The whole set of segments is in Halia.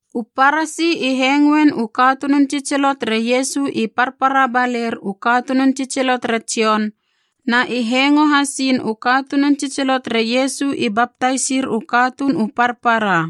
U Parasi i hengoen u katunun tsitsilo tere Iesu i parpara baler u katunun tsitsilo tere Jon, na i hengo hasiin u katunun tsitsilo tere Iesu i baptaisir u katuun u parpara.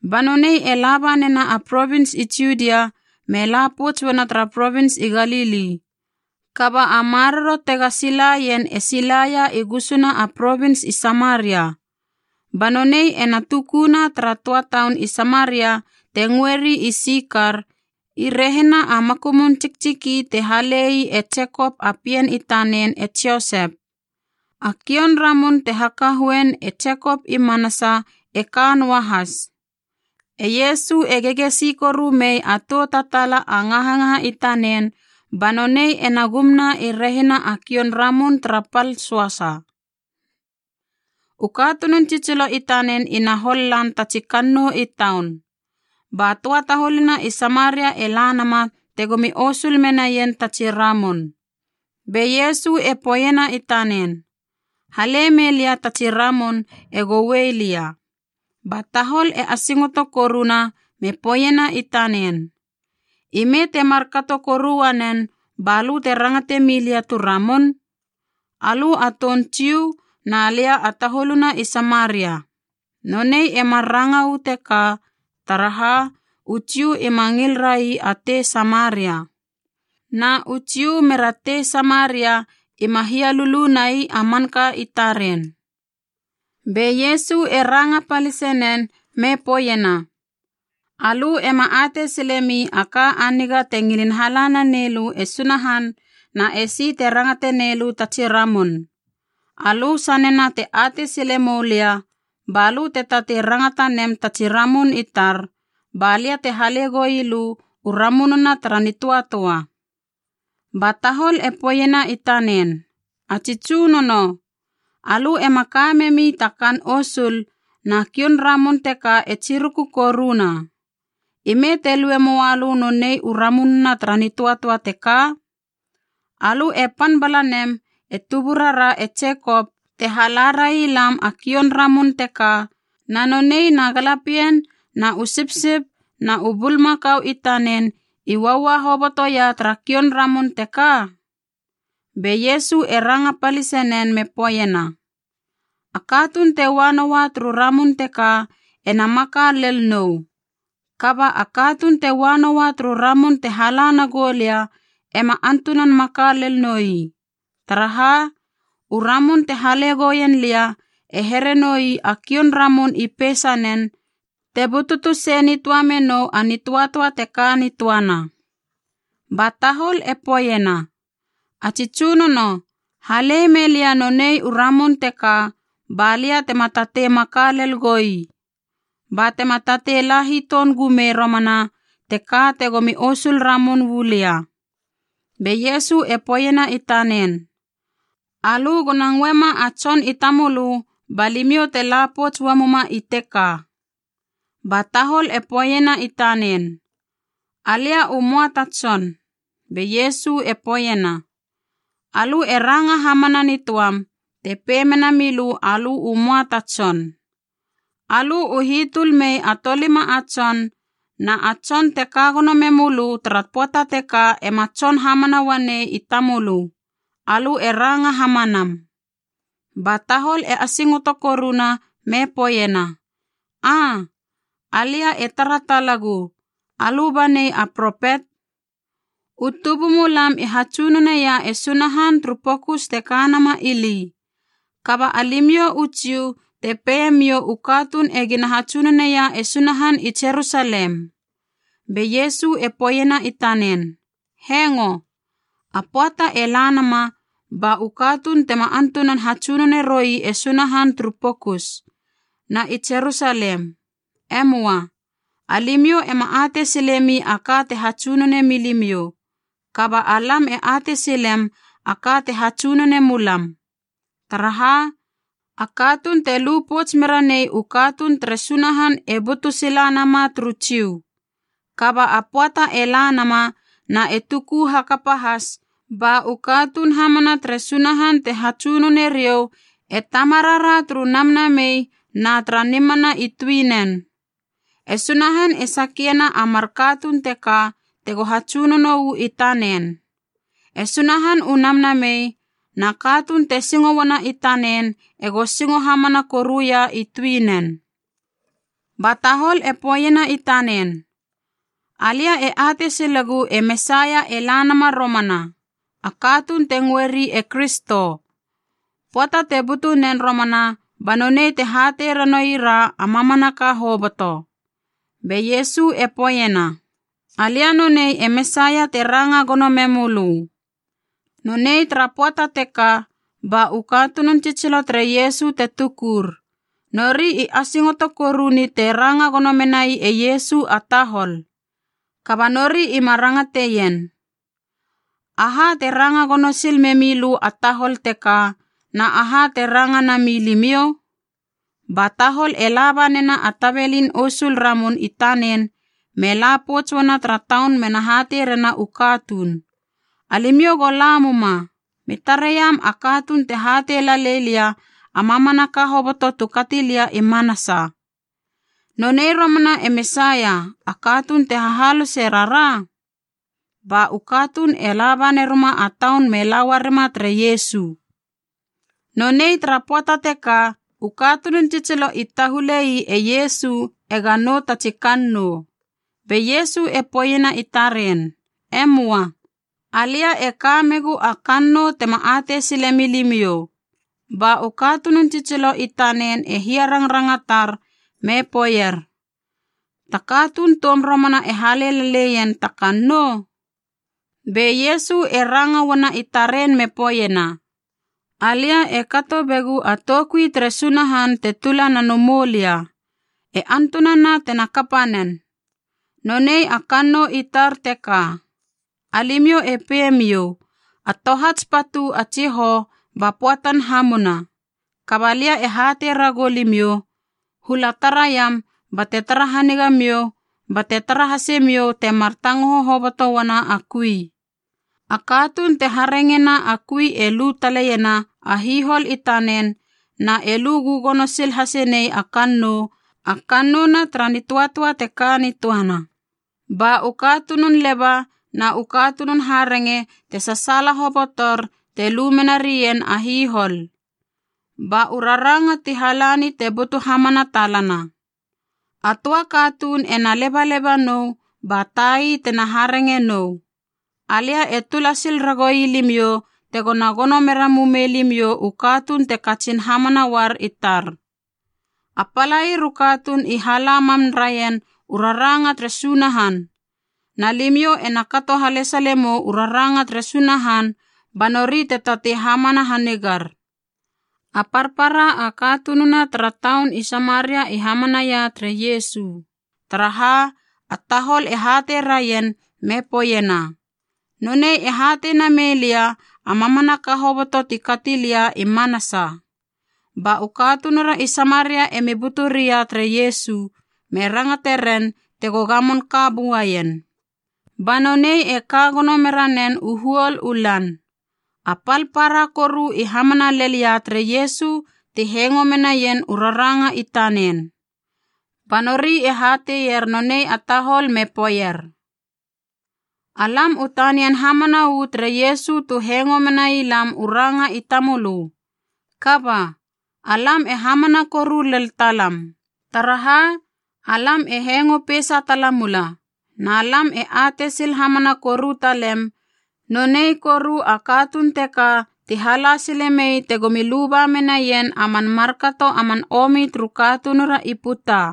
Ba nonei e laba nena a provins i Judia me la pouts uana tara provins i Galili. Kaba a maroro tega silaien e silaia i gusuna a provins i Samaria. Ba nonei ena tukuna tara töa taun i Samaria te ngöeri Sikar i rehina a makumun tsiktsiki te halei e Jekop a pien i tanen e Josep. A kioun ramun te hakahoein e Jekop i manasa e ka noa has. E Iesu e gegesi koru mei a toutatala a ngahangaha i tanen, ba nonei ena gumna i rehina a kioun ramun tara pal söasa. U katunun tsitsilo i tanen ina hol lan tatsi kannou i taun. Ba töa taholuna i Samaria e la nama tegomi osul menaien tatsi ramun. Be Iesu e poeiena i tanen, “Hale mei lia tatsi ramun ego uei lia.” Ba tahol e asingoto koruna me poeiena i tanen, “I me te kato koru uanen balö te rangate milia tu ramun? Alö a toun Jiu na lia a taholuna i Samaria.” (Nonei e mar ranga uu teka, taraha u Jiu ima ngil rai a tei Samaria. Na u Jiu mera tei Samaria ima hia lulu nai a manka i taren.) Be Iesu e ranga palise nen me poeiena, “Alö ema atei silemi a ka a niga te ngilin hala nanei lö e Sunahan na esi te rangate neilö tatsi ramun. Alö sanena te atei sile moulia, balö te tatei rangata nem tatsi ramun i tar, balia te hale goi lö u ramununa tara nitöatöa!” Ba tahol e poeiena i tanen, “A tsi tsunono, alö ema ka memi ta kaan osul na kioun ramun teka e tsiruku koruna. Ime te lue moa lö nonei u ramununa tara nitöatöa teka? Alö e pan bala nem e tuburara e Jekop, te hala railam a kioun ramun teka, na nonei na galapien na u sipsip na u bulmakau i tanen i uaua hobotoia tara kioun ramun teka?” Be Iesu e ranga palise nen me poeiena, “A katuun te ua noua turu ramun teka ena maka lel nou. Kaba a katuun te ua noua turu ramun te hala nagou lia ema antunan maka lel noi. Taraha, u ramun te hale gouien lia e here noi a kioun ramun i peisanen, te bututu sei nitöa menou a nitöatöa te ka nitöana.” Ba tahol e poeiena, “A tsi tsunono halei meilia nonei u ramun teka balia tema tatei maka lel goi, ba tema tatei la hiton gumei romana teka tegomi osul ramun uu lia.” Be Iesu e poeiena i tanen, “Alö gona ngöema a tson i tamölö ba limiou te lapouts uamuma i teka.” Ba tahol e poeiena i tanen, “Alia u möa ta tson.” Be Iesu e poeiena, “Alö e ranga hamana nitoam te pei mena milö alö u möa ta tson. Alö u hitöl mei a tolima a tson, na a tson te ka gono memölö tara pöata teka ema tson hamana uanei i tamölö. Alö e ranga hamanam.” Ba tahol e asingoto koruna me poeiena, “Aa, alia e tara talagu, alö banei a propet. U tubumulam i hatsunoneia e Sunahan turu pokus te ka nama ili. Kaba alimiou u Jiu te peimiou u katuun egina hatsunoneia e Sunahan i Jerusalem.” Be Iesu e poeiena i tanen, “Hengo, a pöata e la nama ba u katuun tema antunan hatsunone roi e Sunahan turu pokus, na i Jerusalem. E möa. Alimiou ema atei silemi a ka te hatsunonei mi limiou. Kaba alam e atei silem a ka te hatsunonei mulam. Taraha, a katuun te lu pouts mera nei u katuun tere Sunahan e butu sila nama turu Jiu. Kaba a pöata e la nama na e tuku hakapa has ba u katuun hamana tere Sunahan te hatsunoneriou e Tamarara turu namnamei na tara nimana i tuinen. E Sunahan e sakiena a mar katuun teka tego hatsunono uu i tanen. E Sunahan u Namnamei, na katuun te singo uana i tanen ego singo hamana koruia i tuinen.” Ba tahol e poeiena i tanen, “Alia e atei silegu e Mesaia e la nama romana, a katuun te ngöeri e Kristo. Pöata te butu nen romana ba nonei te hatei ranoira a mamanaka hoboto.” Be Iesu e poeiena, “Alia nonei e Mesaia te ranga gono memölö.” Nonei tara pöata teka ba u katunun tsitsilo tere Iesu te tukur, nori i asingoto koru ni te ranga gono menai e Iesu a tahol. Kaba nori ima rangateien, “Aha te ranga gono sil memi lö a tahol teka, na aha te ranga nami limiou?” Ba tahol e laba nena a tabelin osul ramun i tanen me lapouts uana tara taun mena hatei rena u katuun, “Alimiou go la muma. Mi tareiam a katuun te hatei lalei lia a mamanaka hoboto tu kati lia i manasa. Nonei romana e Mesaia, a katuun te hahalose rara?” Ba u katuun e laba neruma a taun me la uarima tere Iesu. Nonei tara pöata teka u katunun tsitsilo i tahulei e Iesu ega nou tatsi kannou. Be Iesu e poeiena i taren, “E möa. Alia e ka megu a kannou tema atei sile milimiou.” Ba u katunun tsitsilo i tanen e hiarangrangatar me poeier, “Ta katuun toum romana e hale laleien ta kannou?” Be Iesu e ranga uana i taren me poeiena, “Alia e kato begu a toukui tere Sunahan te tula na moulia, e antunana tena kapa nen. Nonei a kannou i tar teka. Alimiou e pei miou, ‘A tohats patu a tsihou ba pöatan hamuna.’ Kaba lia e hatei ragou limiou, hula taraiam bate tara haniga miou bate tare hase miou temar tangoho hoboto uana a kui. A katuun te harengena a kui e lu taleiena a hihol i tanen na e lu gögono sil hase nei a kannou, a kannouna tara nitöatöa teka nitöana. Ba u katunun leba na u katunun harenge te sasaala hobotor te lu mena rien a hihol. Ba u raranga ti halani te butu hamana talana. ‘A töa katuun ena lebaleba nou ba tai tena harenge nou.’ Alia e tula sil ragou ii limiou tegona gono mera mumei limiou u katuun te katsin hamana uar i tar. A palair u katuun i hala mam raien u raranga tere Sunahan, na limiou ena kato halesalemou u raranga tere Sunahan ba nori te tatei hamana hanigar.” A parpara a katununa tara taun i Samaria i hamanaia tere Iesu, taraha a tahol e hatei raien me poeiena, “Nonei e hatei namei lia a mamanaka hoboto tu kati lia i manasa.” Ba u katunura i Samaria emi butu ria tere Iesu, me rangate ren tego gamon ka buaien. Ba nonei e ka gono mera nen u huol u lan. A pal para koru i hamana lel ia tere Iesu ti hengo menaien u raranga i tanen. Ba nori e hateier nonei a tahol me poeier, “Alam u tanian hamana uu tere Iesu tu hengo menai lam u ranga i tamölö. Kaba, alam e hamana koru lel talam, taraha alam e hengo peisa tala mula, na lam e atei sil hamana koru talem, nonei koru a katuun teka ti hala sile mei tegomi luba menaien a man markato a man omi turu katunura i puta.”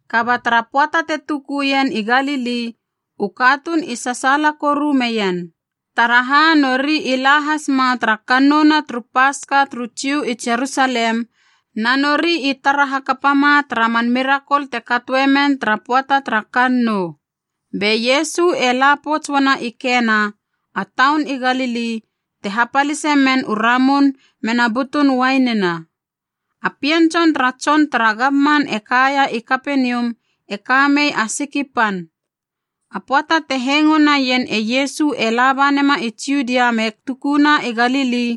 Kaba tara pöata te tukuien i Galili u katuun i sasaala koru meien, taraha nori i la has ma tara kannouna turu Paska turu Jiu i Jerusalem, na nori i tara hakapama tara man mirakol te katoemen tara pöata tara kannou. Be Iesu e la pouts uana i Kena, a taun i Galili te hapalise men u ramun mena butun uainina. A pien tson tara tson tara gamman e kaia i Kapenium e ka mei a siki pan. A pöata te hengo naien e Iesu e laba nema i Judia me tukuna i Galili,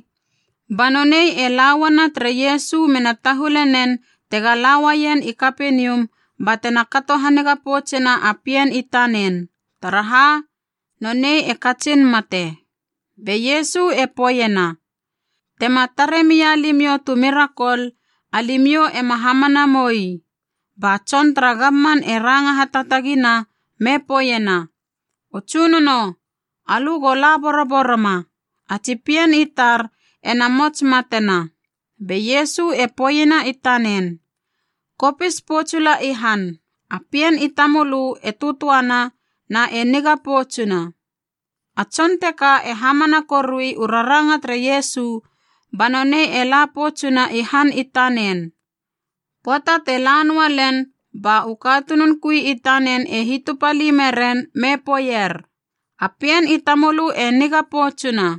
ba nonei e lauana tere Iesu mena tahule nen tega la uaien i Kapenium batena kato haniga poutsena a pien i tanen, taraha nonei e katsin mate. Be Iesu e poeiena, “Tema tare mia limiou tu mirakol, alimiou ema hamana moui.” Ba tson tara gamman e ranga hataatagina me poeiena, “O Tsunono, alö go la boroboroma. A tsi pien i tar ena mots matena.” Be Iesu e poeiena i tanen, “Kopis poutsula i han, a pien i tamölö e töatöana na e niga poutsuna.” A tson teka e hamana korui u raranga tere Iesu ba nonei e la poutsuna i han i tanen. Pöata te la noua len, ba u katunun kui i tanen e hitupali meren me poeier, “A pien i tamölö e niga poutsuna.”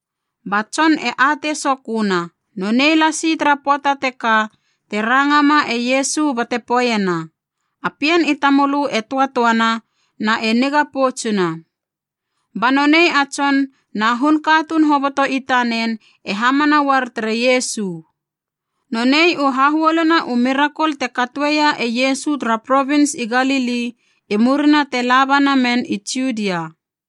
Ba tson e atei soköna, nonei lasi tara pöata teka te rangama e Iesu bate poeiena, “A pien i tamölö e töatöana na e niga poutsuna.” Ba nonei a tson na hun katuun hoboto i tanen e hamana uar tere Iesu. Nonei u hahuoluna u mirakol te katoeia e Iesu tara provins i Galili i murina te laba namen i Judia.